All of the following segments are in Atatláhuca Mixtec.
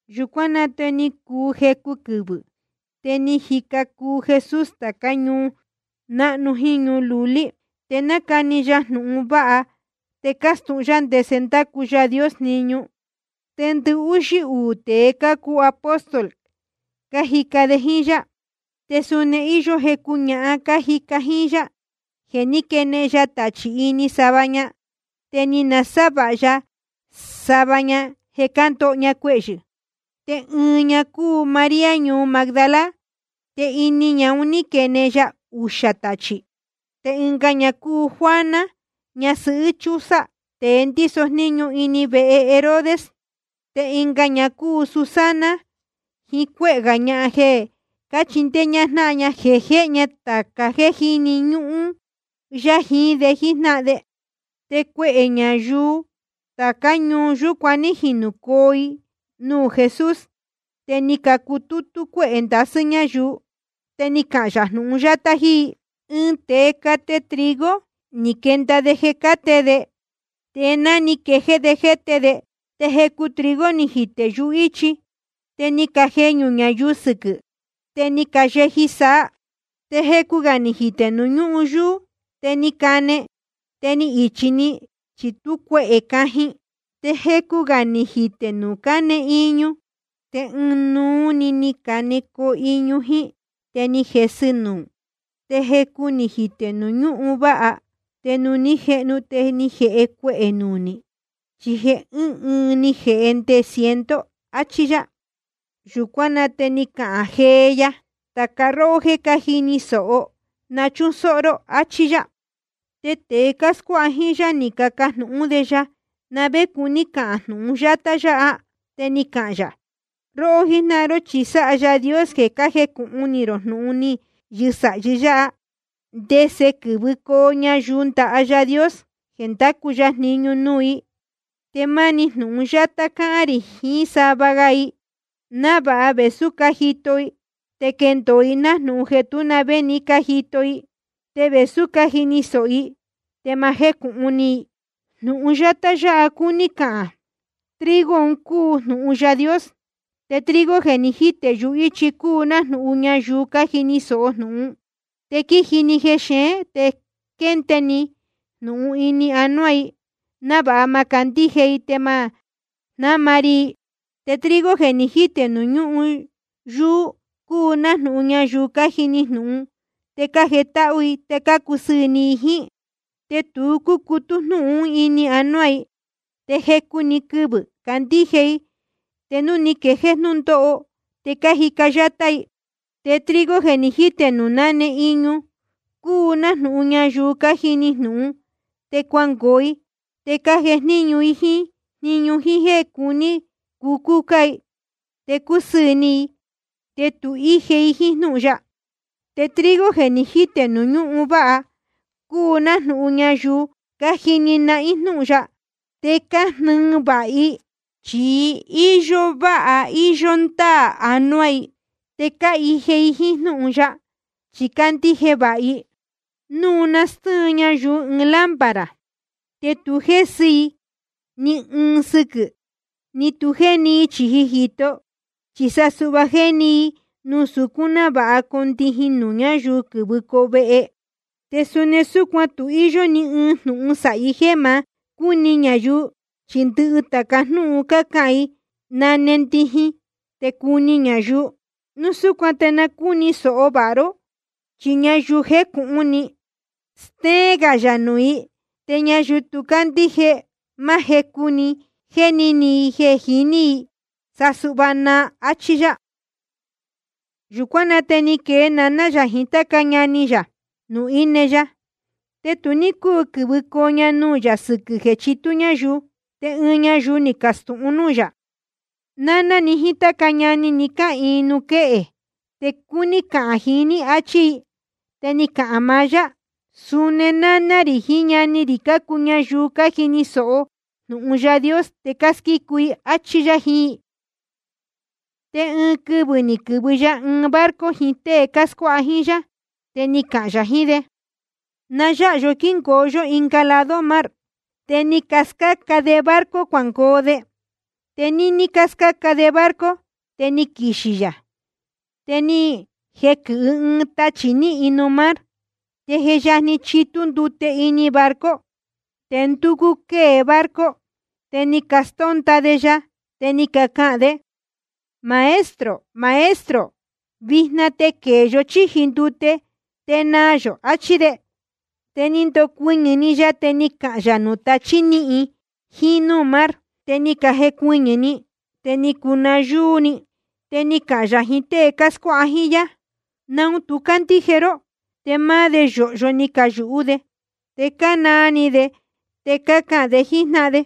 Yūcuán na te ni cuu jecu quɨvɨ̄, te ni jica cuu Jesús tācá ñuu náhnu jíín ñuu lulí. Te nácani ya jnūhun vāha te cástūhun yá ndese ndácu Yaā Dios jniñu. Te ndɨhúxí uū tēe cácuu apóstol, cájica de jíín yá. Te suni íyó jecu ñahan cájica jíín yá, jeē ní quenehen ya tachī ini sava ña, te ni nasávāha ya sava ña jeē cándoho cuehyɨ̄. Te ɨɨn ña cúu María ñuu Magdala, te ini ñahan un ní quenehen ya uxā tachī. Te ɨnga ña cúu Juana, ñasɨhɨ́ Chuza, tēe ndíso jníñu ini vehe Herodes. Te ɨnga ña cúu Susana, jiín cuéhē gā ñahan jeē cáchindéé ñáhán ña, jéhe ña tāca jéē jíni ñúhún yá jiín de jíjnáhan de. Te cuehē ñayuu tācá ñuu yūcuan ní jinūcoo i nuū Jesús. Te ni cacutútú cuéhē ndasɨ́ ñáyuu, te ni cahān yā ɨɨn jnūhun yátá jíín i: Ɨɨn tēe cate trigo, ni quenda de jeē cáte de. Te ná ni quejéé de jéte de, te jecu trigo ni jitē yuhíchi. Te ni cajeñū ñayuu sɨquɨ̄, te ni cayeji saa. Te jecu gā ni jitē nuū ñúhun yuū. Te ni cane, te ni ichī‑ni, chi tú cuehē cajin. Te jecu gā ni jitē nuū náne iñu. Te ɨnuú‑ni ni canecoo iñu jíín, te ni jesɨ nuū. Te jecu ni jitē nuū ñúhun váha. Te nuū ní jehnu, te ni jēhe cuehē nunī, chi jeē ɨ́ɨn ɨɨn ni jēhe nde ciento. Achí yá. Yūcuán na te ni cahān jee ya: Tāca róhó jéē jíni sōho, na chúsóhó ró, achí yá. Te tēe cáscuáha jíín yá ni cacajnūhún de ya na vé cuní cahān jnūhun yátá yáha. Te ni cahān yā: Róhó jíjnáhan ró, chi sáha Yaā Dios jeē cájecūhun ni rō jnūhun ni yɨsāhi yáha, ndese quɨ́vɨcoo ñayuu ndaha Yaā Dios jeē ndacu ya jniñu nuū i. Te máni jíín jnúhun yátá cáhán rī jiín sava ga i, návāha vēsú cájito i, te quéndōo i nájnūhun jeē tú na vé ni cájito i. Te vēsú cájini sōho i, te ma jécūhun ni i. ’Jnūhun yátá yáha cúní cahān: Trigo un cúu jnūhun Yaā Dios. Te trigo jeē ni jítē yuhíchi cúu nájnūhun ñayuu cájini sōho jnūhun, te quíji‑ni jexeén te quénde‑ni jnūhun ini anuá i, návāha ma candíje i te ma jnáma ri i. Te trigo jeē ni jítē nuū ñúhun yuū cúu nájnūhun ñayuu cájini jnūhun, te cájetáhú i te cácusɨɨ̄ ni i jíín. Te tu cúcutú jnúhun ún ini anuá i. Te jecu‑ni quɨvɨ̄ cácandíje i, te núu ni quejéé jnúndóho, te cájica yátá i. Te trigo jeē ni jítē nuū náne iñu cúu nájnūhun ñayuu cájini jnūhun, te cuangoo i te cácujnéñu i jíín jniñu i jíín jéē cuní i cucúcá i te coo sɨɨ̄ ni i. Te tu íje i jíín jnúhun ya. Te trigo jeē ni jítē nuū ñúhun váha cúu nájnūhun ñayuu cájini nahín jnúhun ya, te cájnɨɨ vāha i, chi íyó váha íyó ndáā anuá i. Te cáhije i jíín jnúhun ya, chi cácandíje vāha i. ’Núu nástɨ́ɨn ñayuu ɨɨn lámpara, te tu jésɨ i ni ɨɨn sɨquɨ̄, ni tu jéni i chīji jīto. Chi sa suhva jéni i nuū sucún, návāha cundijin nuū ñáyuu quɨ́vɨcoo vehe. Te suni súcuan tu íyó ni ɨɨn jnūhun sāhi jéē ma cúni ñayuu, chi ndɨhɨ tāca jnúhun cácahān i nane ndijin te cuni ñayuu. ’Núu súcuan te na cúni sōho vāha ró, chi ñayuu je jécūhun ni, stéén gā yā nuū i. Te ñayuu tu cándíje, máá jecu jeē jéni ni i jeē jiní i, sa suhva naa. Achí yá. Yūcuán na te ni quee naná yā jiín táca ñani yā nuū íne ya. Te tu ní cúu quɨ̄vɨcoo ña nuū yā sɨquɨ̄ jeē chitú ñayuu. Te ɨɨn ñayuu ni castūhun núū yā: Náná ni jíín táca ñani ni cáhīin nuū quéhe, te cácuni cahān jiín ní, áchí i. Te ni cahān maá yá: Suni náná rī jiín ñani rī cácuu ñayuu cájini sōho jnūhun Yaā Dios te cásquícu i, áchí yá jiín i. Te ɨɨn quɨvɨ̄ ni quɨ̄vɨ ya ɨɨn barco jiín tée cáscuáha jíín yá, te ni cahān yā jiín de: Na yáha yó quíhīn yō ɨnga lado mar. Te ni cascáca de barco cuangoo de. Te níní cáscáca de barco, te ni quixī yā. Te ni jequɨ̄hɨ ɨɨn tachī níhin nuū mar, te je yajni chitú ndute ini barco, te ndúcú quée barco. Te ni castónda de ya, te ni cacahān de: Maestro, Maestro, vijna te quēe yó chíji ndute te naa yō, achí de. Te ni ndocuɨñɨ̄‑ni ya, te ni cahān yā nuū tachī níhin jíín núū mar. Te ni cajecuɨñɨ̄‑ni, te ni cuu nayúú íī‑ni. Te ni cahān yā jiín tée cáscuáha jíín yá: ¿Naun tu cácandíje ró? Te máá de yōhyo ni cayūhú de, te cánaa ni de, te cácahān de jíín jnáhan de: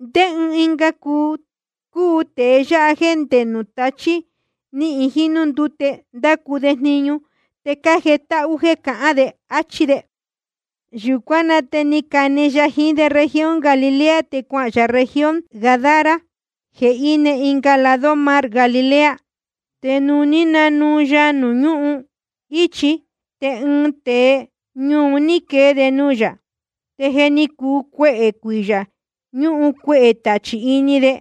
¿Ndé ɨɨn ga cúu tēe yáha jéē nde nuū tachí níhin jiín núū ndúte ndácu de jniñu te cájetáhú jéē cahán de? Achí de. Yūcuán na te ni cane ya jiín de región Galilea, te cuahān yā región Gadara jeē íne ɨnga lado mar Galilea. Te nuū ní nanuu ya nuū ñúhun íchi, te ɨɨn tēe ñuu un ní quee de nuū yā. Te je ni cuu cuehē cuiyā ñúhun cuehē tachī ini de.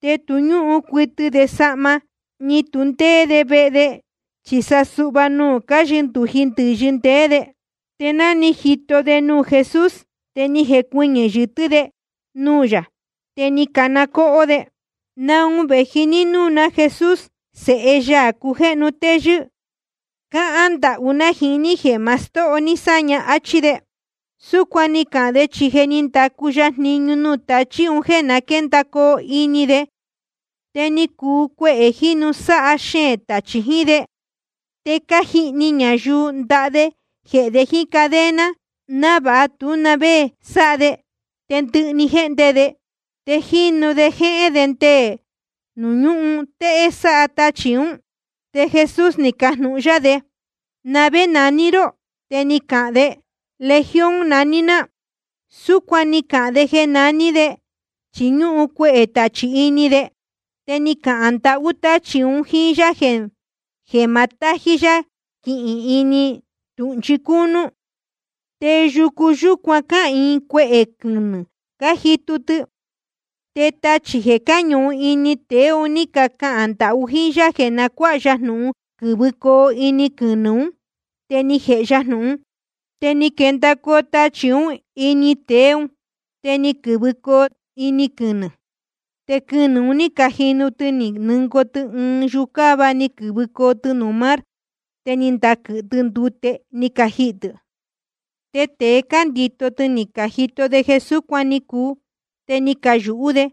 Te tu ñúhun cuɨtɨ de sahma, ni tu ndéé de vehe, chi sa suhva nuū cáyɨndūji ndɨ̄yɨ ndeé de. Te ná ni jito de nuū Jesús, te ni jecuɨñɨ̄ yɨtɨ́ de nuū yā, te ni cana cóhó de: ¿Naun vēji ní núū ná, Jesús Sēhe Yaā cujéhnu téyɨ́? Cáhán ndahú ná jiín ní jeē ma stóho ní sáña, áchí de. Súcuan ni cahān de, chi je ni ndacu ya jniñu nuū tachí un jéē na quéndacoo ini de. Te ni cuu cuehē jínu sáha xeēn tachī jiín de. Te cájihni ñayuu ndaha de jehē de jíín cadena, návāha tú na vé sáha de. Te ndɨhɨ‑ni jéhnde de, te jínu de jéhén de nde nuū ñúhun téhé sáha tachī ún. Te Jesús ni cajnūhun yá de: ¿Na vé naní ró? Te ni cahān de: Legión naní ná. Súcuan ni cahān de jeē naní de, chi ñúhun cuehē tachī ini de. Te ni cacahān ndahú táchī un jíín yá jeē ma tají yá quihīn ini tūhnchi cúnú. Te yucu yúcuan cáhīin cuehē quɨnɨ̄ cájitu tɨ. Te tachī jeē cáñuhun ini tēe un ní cacahān ndahú jíín yá jeē na cuáha ya jnūhun quɨ̄vɨcoo ini quɨnɨ̄ ún. Te ni jēhe ya jnūhun. Te ni quendacoo tachī ún ini tēe ún, te ni quɨ̄vɨcoo ini quɨnɨ̄. Te quɨnɨ̄ un ní cajinu tɨ ni nɨngoo tɨ ɨɨn yucáva, ni quɨ̄vɨcoo tɨ nuū mar, te ni ndaquɨ̄hɨ tɨ ndute, ni cajihī tɨ̄. Te tēe cándito tɨ ni cajito de jeē súcuan ni cuu, te ni cayūhú de.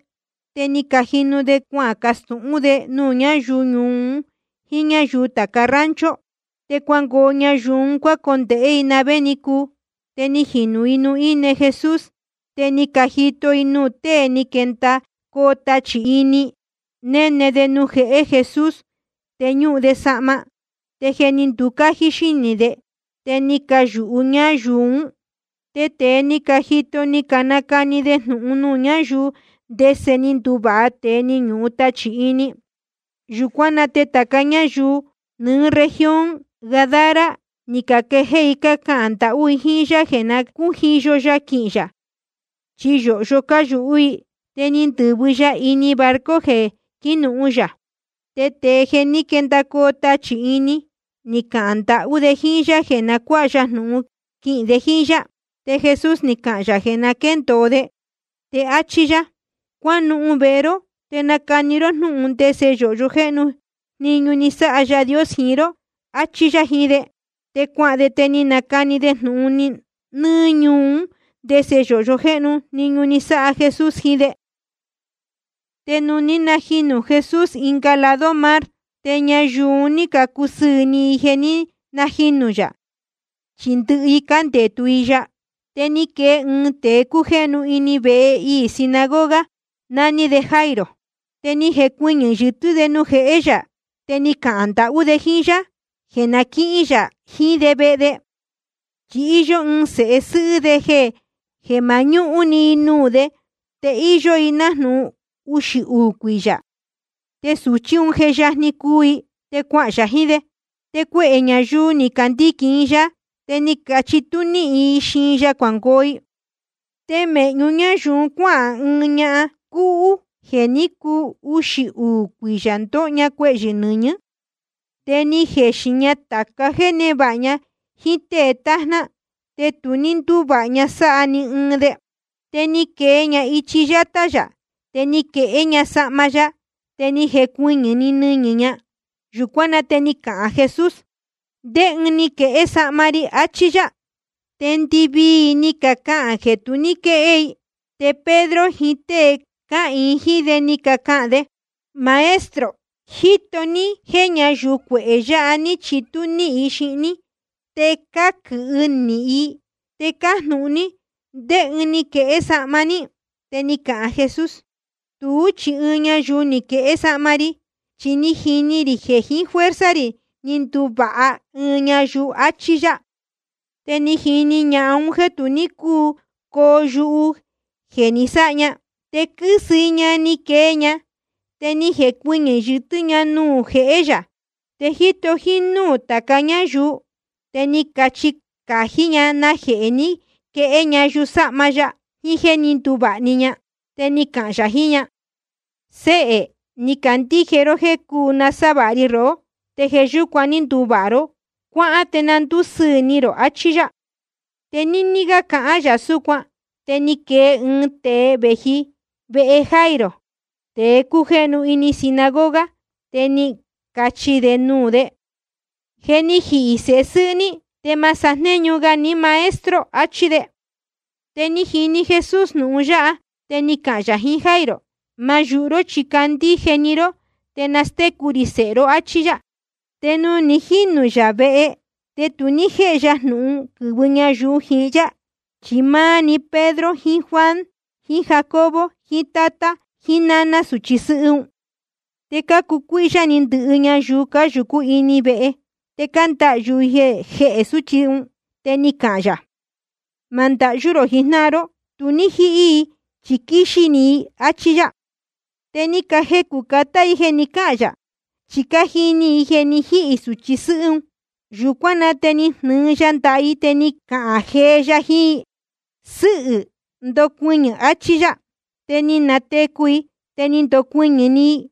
Te ni cajinu de cuacastūhún de nuū ñáyuu ñuu un jíín ñáyuu tāca rancho. Te cuangoo ñayuu un cuácondēhé i na vé ni cuu. Te ni jinūcoo i nuū íne Jesús. Te ni cajito i nuū tée ní quendacoo tachī ini, néne de nuū jehé Jesús, te ñúhun de sahma, te je ni nducájí xínī de. Te ni cayūhu ñáyuu ún. Te tēe ní cajito ni canacani de jnūhun nuū ñáyuu, ndese ni nduvāha tēe ni ñuhun tachī ini. Yūcuán na te tāca ñáyuu nɨ́ɨ́ región Gadara, ni caquejéé i cácahān ndahú i jíín yá jeē na cújiyo ya quihīn yā, chi yōhyo cáyūhú i. Te ni ndɨ̄vɨ ya ini barco jeē quínuhun yā. Te tēe jeē ní quendacoo tachī ini, ni cahān ndahú de jíín yá jeē na cuáha ya jnūhun quihīn de jíín yá. Te Jesús ni cahān yā jeē na quéndōo de, te áchí yá: Cuánuhun vehe ró, te nacani ró jnúhun ndese yōhyo jéhnu jniñu ni sáha Yaā Dios jiín ró, achí yá jiín de. Te cuahān de, te ni nacani de jnūhun nɨ́ɨ́ ñuu ún, ndese yōhyo jéhnu jniñu ni sáha Jesús jiín de. Te nuū ní najinū Jesús ɨnga lado mar, te ñayuu un ní cacusɨɨ̄ ni i jeē ní najinū yā, chi ndɨhɨ i cándetu i ya. Te ni quee ɨɨn tēe cújéhnu ini vehe iī sinagoga, naní de Jairo. Te ni jecuɨñɨ̄ yɨtɨ́ de nuū jehé yā, te ni cahān ndahú de jíín yá jeē na quíhín yā jiín de vehe de. Chi íyó ɨɨn sēhe sɨ́hɨ́ de jeē mañúhún‑ni i nuū de, te íyó i nájnūhun uxī uū cuiyā. Te sūchí un je yajni cuu i. Te cuahān yā jiín de. Te cuehē ñayuu cándiquīn i ya, te ni chitú níhin i xiin ya cuangoo i. Te mēhñu ñáyuu un cuáhān ɨɨn ñahan cúhú jeē ní cuu uxī uū cuiyā ndóho ña cuehyɨ̄ nɨñɨ̄. Te ni jexin ña tāca jéē névāha ña jíín tée tájná, te tu ní ndúvāha ña sáha ni ɨɨn de. Te ni quee ña ichi yátá yā, te ni quehé ña yusáhma ya. Te ni jecuɨñɨ̄‑ni nɨñɨ̄ ña. Yūcuán na te ni cahān Jesús: ¿Ndé ɨɨn ni quehé sahma ri? achí yá. Te ndɨvii i ni cacahān jeē tu ní quéhé i. Te Pedro jiín tée cáhīin jíín de, ni cacahān de: Maestro, jíto ní jéē ñáyuu cuehē yāha ní chitú níhin i xiin ní, te cáquɨ̄hɨ i níhín, te cájnūhun ní ndé ɨɨn ni quehé sahma ní. Te ni cahān Jesús: Tuú chi ɨɨn ñayuu ni quehé sahma ri, chi ni jini rī jeē jiín fuerza rī ni nduvāha ɨɨn ñayuu, achí yá. Te ni jini ñahan un jéē tu ní cúu coo yuhu jeē ni sáha ña. Te quɨ́sɨ i ña ni quee ña, te ni jecuɨñɨ̄ yɨtɨ́ ña nuū jehé yā. Te jíto jínúū tāca ñáyuu, te ni cachi cají ña najehē ni quehé ña yusáhma ya, jiín jéē ní nduvāha‑ni ña. Te ni cahān yā jiín ña: Séhē, ni candíje ró jéē cuu nasávāha ri rohó, te jeē yúcuan ní nduvāha ró. Cuáhán te na ndúsɨɨ̄ ni rō, achí yá. Te níní cáhán gā yā súcuan, te ni quee ɨɨn tēe vēji vehe Jairo, tēe cújéhnu ini sinagoga, te ni cachi nuū de: Je ni jihī sēhe sɨ́hɨ́ ní. Te ma sájnéñu ga ní Maestro, achí de. Te ni jini Jesús jnūhun yáha, te ni cahān yā jiín Jairo: Ma yūhu ró, chi candíje‑ni ró, te nastécu rī sēhe ró, áchí yá. Te ni jinū yā vehe, te tu ní jéhe ya jnūhun quɨ̄vɨ ñayuu jiín yá, chi máá‑ni Pedro jiín Juan jiín Jacobo jiín tátá naná sūchi sɨ́hɨ́ un. Te cácucuíhyá ni ndɨhɨ ñayuu cáyūcú ini vehe, te cándahyū i jehē sūchí un. Te ni cahān yā: Ma ndahyú rō jijnáhan ró. Tu ní jíhí i, chi quíxí‑ni i, áchí yá. Te ni cajecū catá i jeē ni cáhān yā, chi cájini i jeē ni jíhī sūchi sɨ́hɨ́ un. Yūcuán na te ni jnɨɨ ya ndaha i, te ni cahān jee ya jiín i: Sɨ́hɨ̄, ndocuɨñɨ̄, achí yá. Te ni natecu i, te ni ndocuɨñɨ̄‑ni i.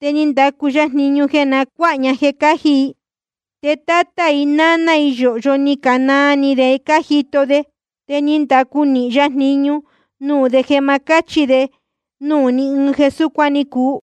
Te ni ndacu ya jniñu jeē na cuáha ña jeē cáji i. Te tátá i náná i yōhyo ni canaa ni de cájito de. Te ni ndacu nīhin ya jniñu nuū de jeē ma cáchi de nuū ni ɨɨn jeē súcuan ni cuu.